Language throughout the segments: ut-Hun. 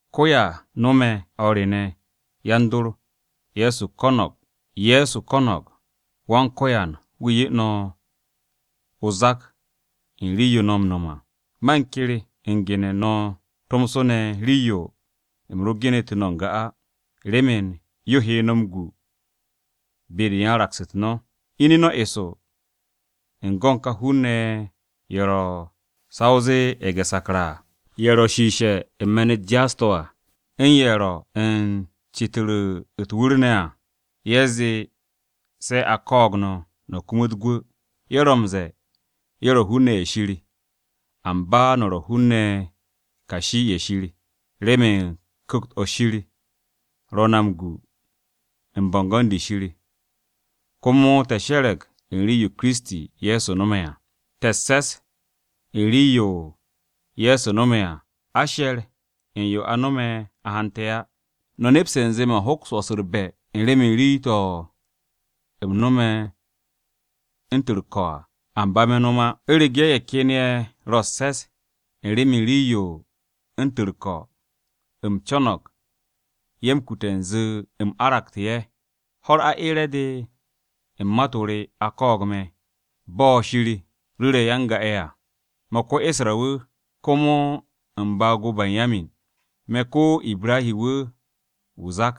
Ko ya no̱me̱, o̱r re ne̱, yan-dor. Ye̱so u̱m ko̱no̱g Wan-Ko̱yan wu̱ 'ye no̱ o-zak u̱n rii-yo no̱ m-no̱m à. Man ker u̱n gene̱ u̱n no̱ tomso ne̱, rii-yo u̱m ro genetu̱ na n-ga á, remen yo he no̱ m-gu be-de yan-raks-u̱t no̱. Ine̱ no̱ eso u̱n go u̱n ka hun-ne̱ ye̱ ro̱ sa o zee ye̱ge̱-sakra à, ye̱ ro̱ shiishe̱ u̱n me̱n-u̱t jaas-to̱ à, u̱n ye̱ ro̱ u̱n ce̱tu̱ru̱ u̱t-wu̱r ne̱ à, ye̱ zee se a ko̱o̱g no̱, no̱ kumut gwu̱. Ye̱ ro̱ m-ze̱e̱ ye̱ ro̱ hun-ne̱ ye̱ Shir, amba na ro̱ hun-ne̱ kashi-ye̱ Shir, remen Ku̱kt-o̱ Shir ro̱ na m-gu u̱n bo̱ngo̱n-de Shir, komo te̱ she̱re̱g u̱n rii-yo Kiristi, Ye̱so no̱me̱ à. Te̱ u̱s-se̱s u̱n rii-yo Ye̱so no̱me̱ à, a she̱r u̱n yo a no̱me̱ a hante̱ á. No̱ nepste̱ u̱nze man hoks m-wo̱s u̱r-be̱ remen rii-to̱ no̱me̱ u̱ntu̱n u̱r-ko̱ à. Amba me̱ no̱m á. U̱rege̱ ye̱ ken ye̱ ro̱ u̱s-se̱s remen rii u̱ntu̱n u̱r-ko̱, u̱m co̱no̱g ye̱ m-kute̱ u̱nze u̱m aragsu̱te̱ ye̱. Ho̱-u̱r aeere̱-de u̱n mat-o re, a ko̱o̱g me̱, bo̱ Shir ru̱re̱ ya-n-ga-ye̱ à. Me̱ ko-Isra-wu̱, komo u̱n baag-o Banyamin. Me̱ ko-Ibra wu̱ zak.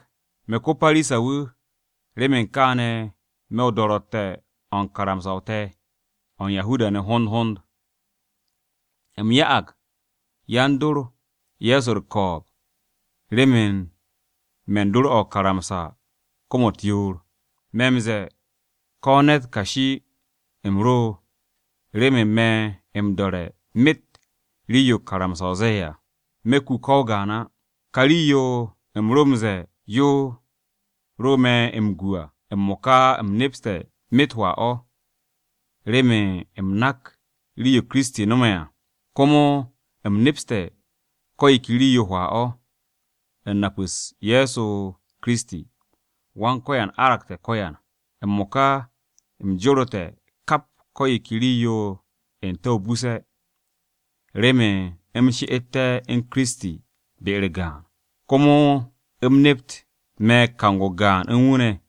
Me̱ ko-Parisa-wu̱, remen kaane̱, me̱ o-do̱ro̱tte̱ o̱ u̱n karamsa-o te̱, o̱ u̱n Yahuda-ne̱ hond hond. U̱m ya'ag yan-dor Ye̱so u̱r-ko̱o̱b remen me̱n dor o̱ o-karamsa kom-u̱t yoor. Me̱ m-ze̱e̱ ko̱ ne̱t kashi u̱m ro remen me̱ m-do̱re̱ myet rii-yo karamsa-o ze̱e̱ à. Me̱ ku ko̱ o-gaan á. Ka rii-yo u̱m ro m-ze̱e̱ yo ro me̱ m-gu à, m-mo̱ka u̱m nepste̱ myet hwaa-o̱, remen u̱m nak rii-yo Kiristi no̱me̱ à. Komo u̱m nepste̱ ko̱ yo ke rii-yo hwaa-o̱, nap-u̱s Ye̱so Kiristi, Wan-Ko̱yan aragte̱ ko̱yan. M-mo̱ka u̱m jorete̱ kap ko̱ yo ke rii-yo n-te̱ o-buse̱, remen u̱m she'etté̱ u̱n Kiristi ne̱, be-u̱r gaan. Komo u̱m nept me̱ kang-o gaan u̱n wu̱ ne̱,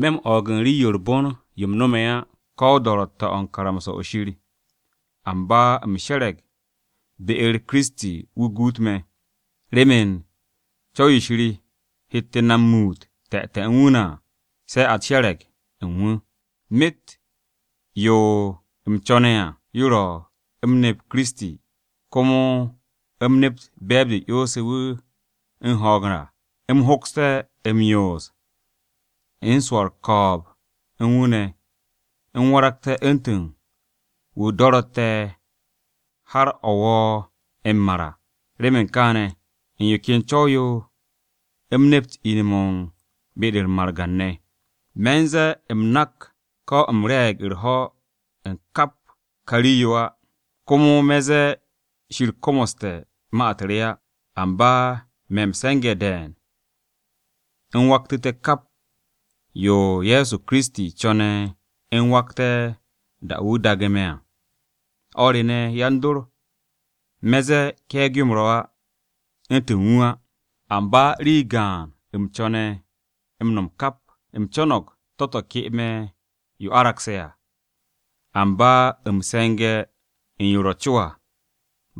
me̱ m-o̱o̱g u̱n rii-yo u̱r-bon yo u̱m no̱me̱ á ko̱ do̱ro̱tte̱-o̱ u̱n karamsa-o̱ Shir. Amba u̱m she̱re̱g be-u̱r Kiristi wu̱ guut me̱, remen co̱w-yo Shir hette̱ na muut te̱te̱ u̱n wu̱ ne̱ à, se̱ a she̱re̱g u̱n wu̱. Myet yo u̱m co̱ne̱ à, yo ro̱ u̱m nep Kiristi, komo u̱m nept be̱e̱b-de 'yonse̱ wu̱ u̱n ho̱o̱g à. U̱m hokste̱ m-yoos u̱n swo̱ u̱r-ko̱o̱b u̱n wu̱ ne̱, u̱m waragté̱ u̱ntu̱n wa o-do̱ro̱tte̱ har o̱ wo m-mar à. Remen kaane̱, u̱n yo ken co̱w-yo u̱m nept ine̱-mo̱ u̱n margan-ne̱. Me̱ ze̱e̱ u̱m nak ko̱ u̱m re̱e̱g u̱r-ho̱ u̱n kap ka rii-yo á. Komo me̱ ze̱e̱ Shir komoste̱ ma-u̱t re á. Amba me̱ m-se̱nge̱ de̱e̱n, u̱m waktu̱te̱ kap yo Ye̱so Kiristi, co̱ne̱ u̱m wakte̱ da-o̱ wu̱ daage̱ me̱ à. O̱r re ne̱, yan-dor, me̱ ze̱e̱ ke̱e̱g-yo u̱m ro̱ á, u̱ntu̱n wu̱ á. Amba rii gaan u̱m co̱ne̱ m-no̱m kap: u̱m co̱no̱g to̱-to̱ ke me̱ yo aragse̱ à, amba u̱m se̱nge̱ u̱n yo ro̱ co à.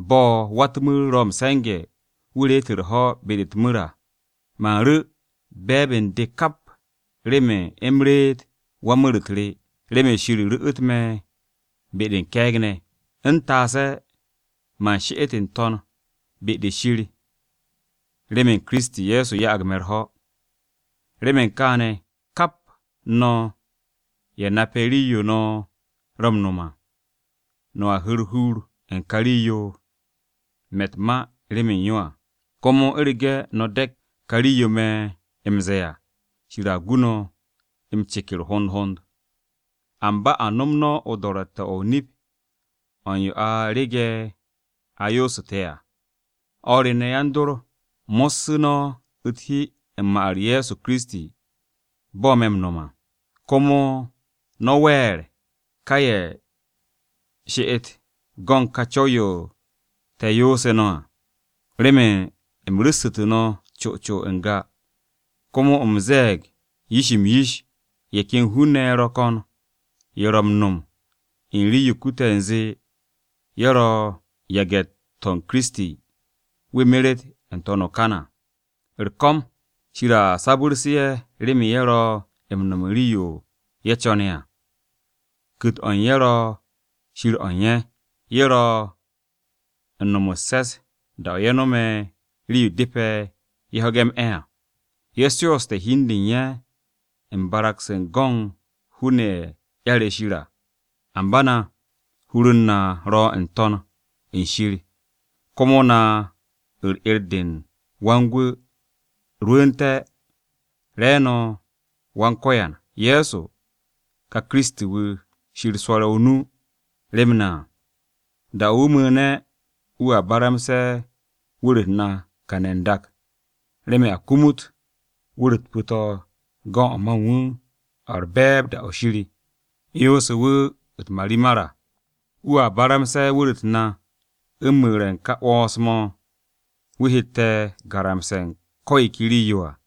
Bo̱ wa-u̱t-mu̱r ro̱ m-se̱nge̱, wu̱ reet u̱r-ho̱ be-de u̱t-mu̱r à, man ru̱ be̱e̱b u̱n de kap remen u̱m reet wan-mu̱r-u̱t re, remen Shir ru̱'u̱t me̱ be-de u̱n ke̱e̱g ne̱. U̱m she'ete̱ n-to̱n be-de Shir remen Kiristi, Ye̱so ya'ag me̱ u̱r-ho̱. Remen kaane̱, kap no̱, ye̱ nape̱ rii-yo no̱ ro̱ m-no̱m à, no̱a hu̱u̱ u̱r-hur u̱n ka rii-yo me̱ u̱t-ma remen yo à. Komo u̱rege̱ no̱ de̱k ka rii-yo me̱ m-ze̱e̱ á, Shir a gu no̱ m-ceker hond hond. Amba a nom no̱ o-do̱ro̱tte̱ o̱ o-nip o̱ u̱n yo a rege̱ a yoosu̱te̱ à. O̱r re ne̱, yan-dor, mo̱ssu̱ no̱ u̱t-hi u̱n ma-u̱r Ye̱so Kiristi, bo̱ me̱ m-no̱m à. Komo no̱ wer ka ye̱ ro̱ u̱r-she'et u̱n go̱n ka co̱w-yo te̱ yoosu̱ no̱ à. Remen u̱m ru̱ssu̱tu̱ no̱ co co n-ga, komo u̱m ze̱e̱g yo yish-m yish, ye̱ ken hun-ne̱ ye̱ ro̱ ko̱n ye̱ ro̱ m-no̱m u̱n rii-yo kute̱ u̱nze ye̱ ro̱ yan-yage̱-u̱t Kiristi, wu̱ meret n-to̱n o-kan à. U̱r-ko̱m, Shir a sabu̱rse̱ ye̱ remen ye̱ ro̱ m-no̱m u̱n rii-yo ye̱ co̱ne̱ à, ku̱t-o̱ u̱n ye̱ ro̱ Shir o̱ u̱n ye̱, ye̱ ro̱ u̱n no̱m u̱s-se̱s da-o̱ ye̱ no̱me̱ rii-yo depe̱ ye̱ ho̱ge̱ m-'e̱ à. Ye̱ shooste̱ hi-de u̱n ye̱ u̱n barag-se go̱n hun-ne̱ ye̱ 'yare̱ Shir à. Amba na, hur-u̱r na ro̱ n-To̱n u̱n shir komo na u̱r-'er de u̱n Wan-Gwu̱ rwu̱u̱nte̱ re̱e̱no̱ Wan-Ko̱yan, Ye̱so, ka Kiristi-wu̱, wu̱ Shir swo̱re̱ o-nu rem na à. Da-o̱ wu̱ mu̱u̱ne̱ wu̱a baramse̱ wu̱r-u̱t na kane̱ n-dak remen a kumut wu̱r-u̱t pu̱-to̱ go̱n o̱ ma u̱n wu̱ o̱ u̱r-be̱e̱b da-o̱ Shir 'yonse̱ wu̱ u̱t-marimar à. Wu̱a baramse̱ wu̱r-u̱t na u̱n mu̱re̱ u̱n ka 'wo̱ns-mo̱ wu̱ hette̱ garamse̱ u̱n ko̱ yo ke rii-yo à.